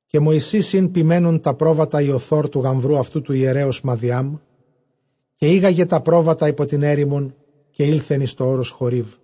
Καὶ Μωυσῆς ἦν ποιμαίνων τὰ πρόβατα Ἰοθὸρ τοῦ γαμβροῦ αὐτοῦ, τοῦ ἱερέως Μαδιὰμ, καὶ ἤγαγεν τὰ πρόβατα ὑπὸ τὴν ἔρημον, καὶ ἦλθεν εἰς τὸ ὄρος Χωρήβ.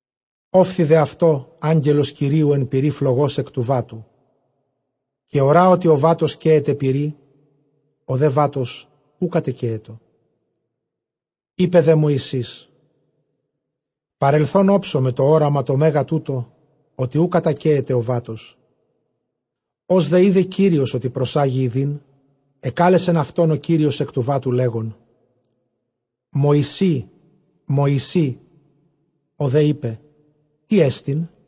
Ὤφθη δὲ αὐτῷ Ἄγγελος Κυρίου ἐν πυρὶ φλογὸς ἐκ τοῦ βάτου· καὶ ὁρᾷ ὅτι ὁ βάτος καίεται πυρί, ὁ δὲ βάτος οὐ κατεκαίετο. Εἶπε δὲ Μωυσῆς, παρελθὼν ὄψομαι τὸ ὅραμα τὸ μέγα τοῦτο, ὅτι οὐ κατακαίεται ὁ βάτος. Ὡς δὲ εἶδεν Κύριος ὅτι προσάγει ἰδεῖν, ἐκάλεσεν αὐτὸν Κύριος ἐκ τοῦ βάτου, λέγων, Μωυσῆ, Μωυσῆ· ὁ δὲ εἶπε, τί ἐστιν;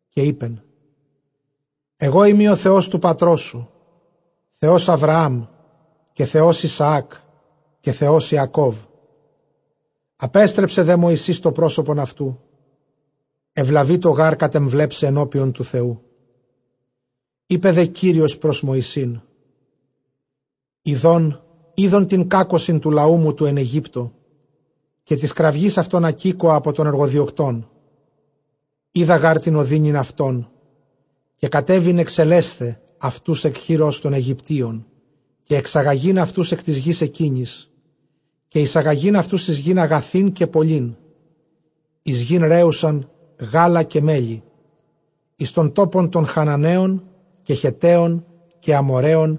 Καὶ εἶπεν, ἐγώ εἰμι ὁ Θεὸς τοῦ πατρός σου, Θεὸς Ἁβραὰμ, καὶ Θεὸς Ἰσαὰκ, καὶ Θεὸς Ἰακώβ· ἀπέστρεψε δὲ Μωυσῆς τὸ πρόσωπον αὐτοῦ, εὐλαβεῖτο γὰρ κατεμβλέψαι ἐνώπιον τοῦ Θεοῦ. Εἶπε δὲ Κύριος πρὸς Μωυσῆν, ἰδὼν εἶδον τὴν κάκωσιν τοῦ λαοῦ μου τοῦ ἐν Αἰγύπτῳ, καὶ τῆς κραυγῆς αὐτῶν ἀκήκοα ἀπὸ τῶν ἐργοδιωκτῶν· οἶδα γὰρ τὴν ὀδύνην αὐτων, καὶ κατέβην ἐξελέσθαι αὐτοὺς ἐκ χειρὸς τῶν Αἰγυπτίων, καὶ ἐξαγαγεῖν αὐτοὺς ἐκ τῆς γῆς ἐκείνης, καὶ εἰσαγαγεῖν αὐτοὺς εἰς γῆν ἀγαθὴν καὶ πολλήν, εἰς γῆν ῥέουσαν γάλα καὶ μέλι, εἰς τὸν τόπον τῶν Χαναναίων, καὶ Χετταίων, καὶ Ἀμοῤῥαίων,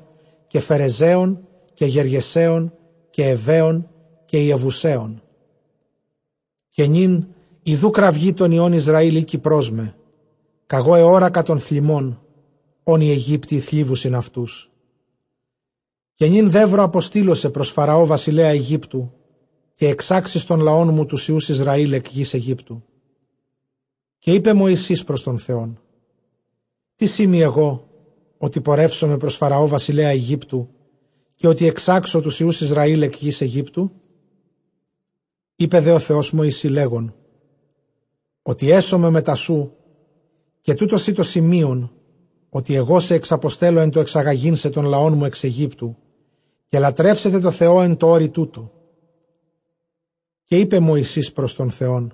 καὶ Φερεζαίων, καὶ Γεργεσαὶων, καὶ Εὐαίων, καὶ Ἰεβουσαίων. Καὶ νῦν ἰδοὺ κραυγὴ τῶν υἱῶν Ἰσραὴλ ἥκει πρὸς με· κᾀγὼ ἑώρακα τὸν θλιμμὸν, ὃν οἱ Αἰγύπτιοι θλίβουσιν αὐτούς. Καὶ νῦν δεῦρο, ἀποστείλω σε πρὸς Φαραὼ βασιλέα Αἰγύπτου, καὶ ἐξάξεις τὸν λαόν μου τοὺς υἱοὺς Ἰσραὴλ ἐκ γῆς Αἰγύπτου. Καὶ εἶπε Μωυσῆς πρὸς τὸν Θεὸν, τίς εἰμι ἐγὼ, ὅτι πορεύσομαι πρὸς Φαραὼ βασιλέα Αἰγύπτου, καὶ ὅτι ἐξάξω τοὺς υἱοὺς Ἰσραὴλ ἐκ γῆς Αἰγύπτου; Εἶπε δὲ ὁ Θεὸς Μωυσῇ, λέγων, ὅτι ἔσομαι μετὰ σοῦ· καὶ τοῦτό σοι τὸ σημεῖον ὅτι ἐγώ σε ἐξαποστελῶ, ἐν τῷ ἐξαγαγεῖν σε τὸν λαόν μου ἐξ Αἰγύπτου, καὶ λατρεύσετε τῷ Θεῷ ἐν τῷ ὄρει τοῦτῳ. Καὶ εἶπε Μωυσῆς πρὸς τὸν Θεὸν,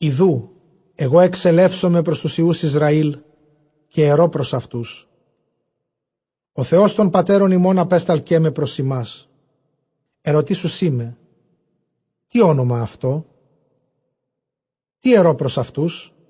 ἰδοὺ ἐγὼ ἐξελεύσομαι πρὸς τοὺς υἱοὺς Ἰσραὴλ, καὶ ἐρῶ πρὸς αὐτοὺς, ὁ Θεὸς τῶν πατέρων ἡμῶν ἀπέσταλκέ με πρὸς ὑμᾶς· ἐρωτήσουσί με, τί ὄνομα αὐτῷ; τί ἐρῶ πρὸς αὐτούς;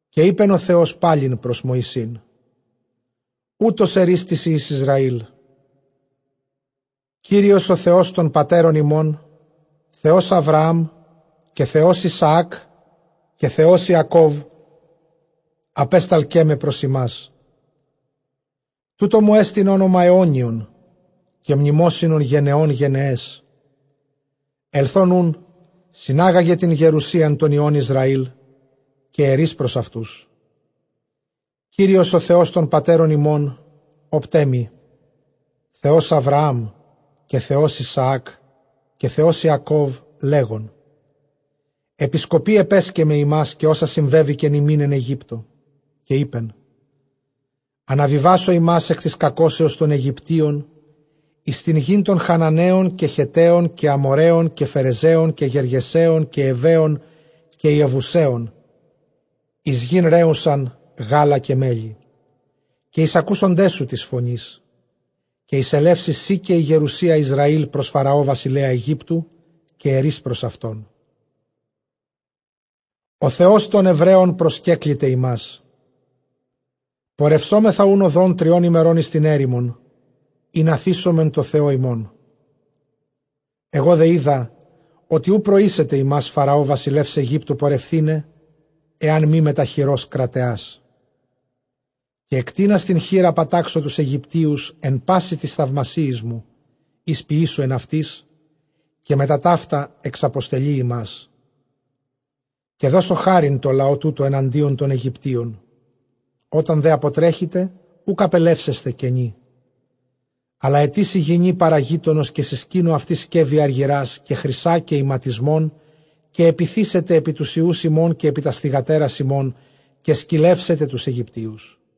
Καὶ εἶπεν ὁ Θεὸς πάλιν πρὸς Μωυσῆν, οὕτως ἐρεῖς τοῖς υἱοῖς Ἰσραήλ, Κύριος ὁ Θεὸς τῶν πατέρων ἡμῶν, Θεὸς Ἀβραὰμ, καὶ Θεὸς Ἰσαὰκ, καὶ Θεὸς Ἰακὼβ, ἀπέσταλκέ με πρὸς ὑμᾶς· τοῦτό μου ἐστὶν ὄνομα αἰώνιον, καὶ μνημόσυνον γενεῶν γενεαῖς. Ἐλθὼν οὐν συνάγαγε τὴν γερουσίαν τῶν υἱῶν Ἰσραὴλ, καὶ ἐρεῖς πρὸς αὐτοὺς, Κύριος ὁ Θεὸς τῶν πατέρων ἡμων ὦπταί μοι, Θεὸς Ἀβραὰμ, καὶ Θεὸς Ἰσαὰκ, καὶ Θεὸς Ἰακὼβ, λέγων, ἐπισκοπῇ ἐπέσκεμμαι ὑμᾶς, καὶ ὅσα συμβέβηκεν ὑμῖν ἐν Αἰγύπτῳ. Καὶ εἶπεν, ἀναβιβάσω ὑμᾶς ἐκ τῆς κακώσεως τῶν Αἰγυπτίων, εἰς τὴν γῆν τῶν Χαναναίων, καὶ Χετταίων, καὶ Ἀμοῤῥαίων, καὶ Φερεζαίων, καὶ Γεργεσαίων, καὶ Εὑαίων, καὶ Ἰεβουσαίων, εἰς γῆν ῥέουσαν γάλα καὶ μέλι. Καὶ εἰσακούσονταί σου τῆς φωνῆς· καὶ εἰσελεύσῃ σὺ, καὶ ἡ γερουσία Ἰσραὴλ, πρὸς Φαραὼ βασιλέα Αἰγύπτου, καὶ ἐρεῖς πρὸς αὐτὸν ὁ Θεὸς τῶν Ἑβραίων προσκέκληται ἡμᾶς· πορευσόμεθα οὖν ὁδὸν τριῶν ἡμερῶν εἰς τὴν ἔρημον, ἵνα θύσωμεν τῷ Θεῷ ἡμῶν. Ἐγὼ δὲ οἶδα ὅτι οὐ προήσεται ὑμᾶς Φαραὼ βασιλεὺς Αἰγύπτου πορευθῆναι, ἐὰν μὴ μετὰ χειρὸς κραταιᾶς. Καὶ ἐκτείνας τὴν χεῖρα, πατάξω τοὺς Αἰγυπτίους ἐν πᾶσι τοῖς θαυμασίοις μου, οἷς ποιήσω ἐν αὐτοῖς· καὶ μετὰ ταῦτα ἐξαποστελεῖ ὑμᾶς. Καὶ δώσω χάριν τῷ λαῷ τούτῳ ἐναντίον τῶν Αἰγυπτίων· ὅταν δὲ ἀποτρέχητε, οὐκ ἀπελεύσεσθε κενοί· Ἀλλὰ αἰτήσει γυνὴ παρὰ γείτονος καὶ συσκήνου αὐτῆς σκεύη ἀργυρᾶ, καὶ χρυσᾶ, καὶ ἱματισμόν· καὶ ἐπιθήσετε ἐπὶ τοὺς υἱοὺς ὑμῶν, καὶ ἐπὶ τὰς θυγατέρας ὑμῶν, καὶ σκυλεύσατε τοὺς Αἰγυπτίους.